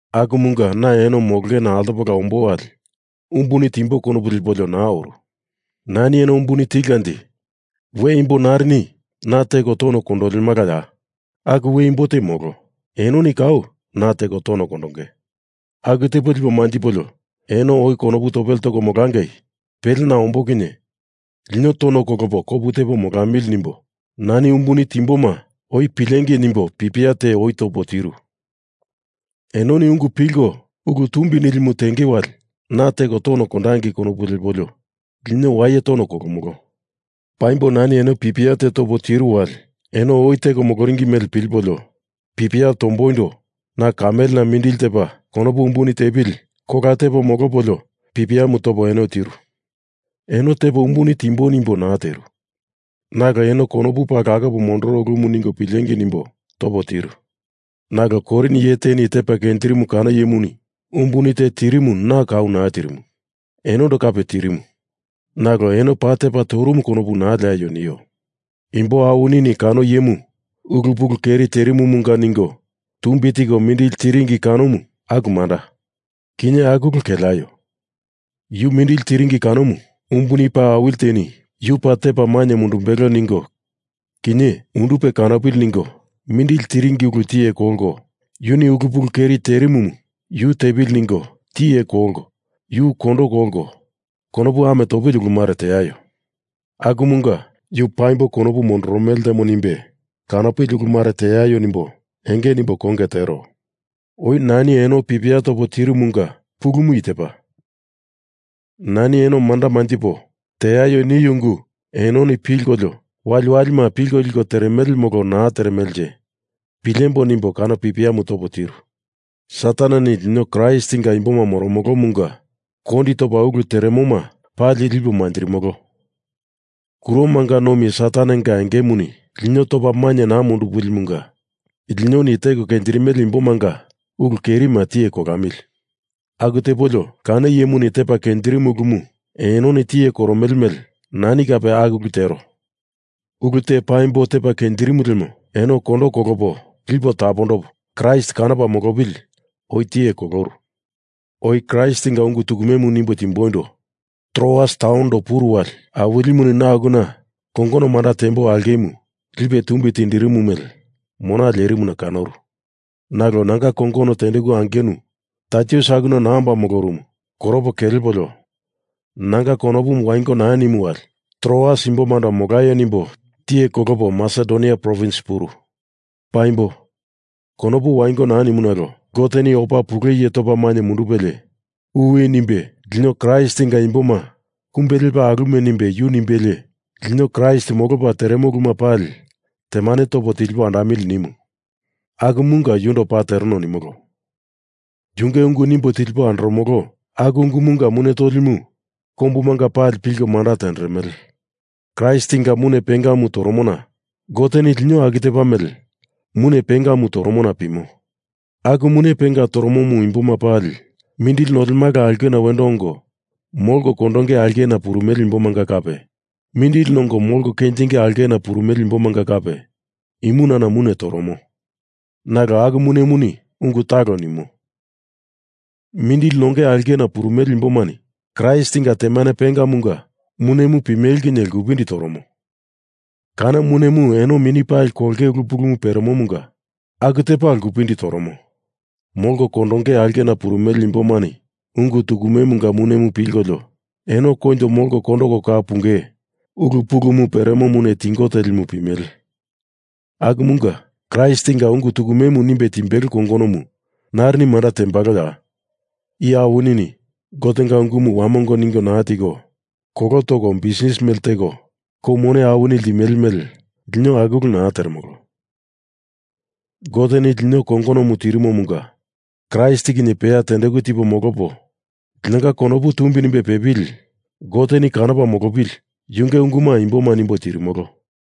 Akumunga na eno molongena altopola ombo wali umbuni timbo konopu lepolio naa oru. Nani eno umbuni tilkanje we imbo narini na teko tono kondolemalaya? Aku we imbo te molo, enoni kau na teko tono kondonge. Aku tepo lipo manjipolio eno oi konopu topele toko molangei, pele na ombo kinye lino tono kolopo kopu tepo molamili nimbo nani umbuni timboma oi pilengei nimbo pipia te oi topo tiru. Enoni ungu pilko ulu tumbi nilimu tenge wali na teko tono kondangei konopu lepolio lino waye tono kolomolo. Paimbo nani eno pipia te topo tiru wali eno oi teko moloringi mele pilipolio pipia tomboindo na kamelena paa mindili tepa konopu umbuni tepili kola tepo molopolio pipiamu topo eno tiru. Eno tepo umbuni tiemboi nimbo naa tiru. Nalo eno konopu paa lakopa mondoro ulumu ningo pilengei nimbo topo tiru. Nalo Korin iye teni tepa kenjirimu kano iyemuni umbuni te tirimu na kau naa tirimu. Enondo kape tirimu, nalo eno paa tepa torumu konopu naa leaio nio. Imbo awinini kano iyemu ulu pulu keri terimumunga ningo tumbi tiko mindili tiringi kanomu, aku manda. Kinye aku ulu keleaio! Yu mindili tiringi kanomu umbuni paa awili teni yu paa tepa mainye mundumbelo ningo kinye, undupe kanopili ningo mindili tiringi ulu tiye kolko yuni ulu pulu keri terimumu yu tepili ningo tiye kolko yu kondo kolko, konopu ame topili ulu mare teaio. Akumunga yu paimbo konopu mondoromele ltemo nimbe kanopili ulu mare teaio nimbo enge nimbo konge tero. Oi nani eno pipia topo tirumunga pulumu i tepa. Nani eno manda manjipo, teaio nio ungu enoni pilkolio waliwalima pilko liko teremele molo naa teremelenje, pilembo nimbo kano pipiamu topo tiru. Sataneni lino Kraistinga imboma moromolomunga kondi topa ulu teremoma pali lipo manjirimolo. Kuromanga nomi Satanenga engemuni lino topa mainye naa mundupilimunga linoni teko kenjirimele imbomanga ulu kerima tiye kolamili. Aku tepolio kano iyemuni tepa kenjirimu ulumu enoni tiye koromele mele nani kape aku ulu tero. Ulu te paimbo tepa kenjirimu lemo eno kondo kolopo lipo tapondopo Kraist kanopa molopili oi tiye koloru. Oi Kraistinga ungu tukume nimbo timboindo Troas taunondo puru wali Awilimuni na akuna kongono manda tembo aulkemu lipe tumbi tindirimu mele mona lierimuna kanoru. Nalo nanga kongono tendeku angenu Taitus akuna naa omba molorumu koropo kelepolio nanga konopumu wango naa nimu wali Troas imbomando molaio nimbo tiye kolopo Masedonia provins puru. Paimbo, konopu wango naa nimu nalo Goteni opa pule iye topa mainye mundupelie uwi nimbe lino Kraistinga imboma kumbe lepa alume nimbe yu pumbelie lino Kraist molopa teremo uluma pali temane topo tilipo andamili nimu. Akumunga yundo paa tereno nimolo. Yunge ungu nimbo tilipo andoromolo, aku ungumunga mune tolimu kombumanga pali pilko manda tenderemele. Kraistinga mune pengamu toromona Goteni lino aku tepa mele mune pengamu toromona pimo. Aku mune penga toromomu imboma pali, mindili nolemala aulkena wendo ongo molko kondonge aulkena purumele imbomanga kape mindili nongo molko kenjinge aulkena purumele imbomanga kape, imunana mune toromo. Nalo aku munemuni ungu talo nimo. Mindili nonge aulkena purumele imbomani Kraistinga temane pengamunga munemu pimele kinye lkupindi toromo. Kano munemu eno mini pali kolonge ulu pulumu peremomunga aku tepa lkupindi toromo. Molko kondonge aulkena purumele imbomani ungu tukumemunga munemu pilkolio, eno koinjo molko kondoko kau punge ulu pulumu peremo mune tingo telimu pimele. Akumunga Kraistinga ungu tukumemu nimbe timbelo kongonomu narini manda tembaloya? Iye awinini Gotenga ungumu wamongo ningo naa tiko kolo toko bisnis mele teko kou mone awini limele mele lino aku ulu naa teremolo. Goteni lino i kongonomu tirimomunga Kraist kinye peya tendeku tipo molopo linonga konopu tumbi nimbe pepili Goteni kanopa molopili yunge unguma imboma nimbo tirimolo.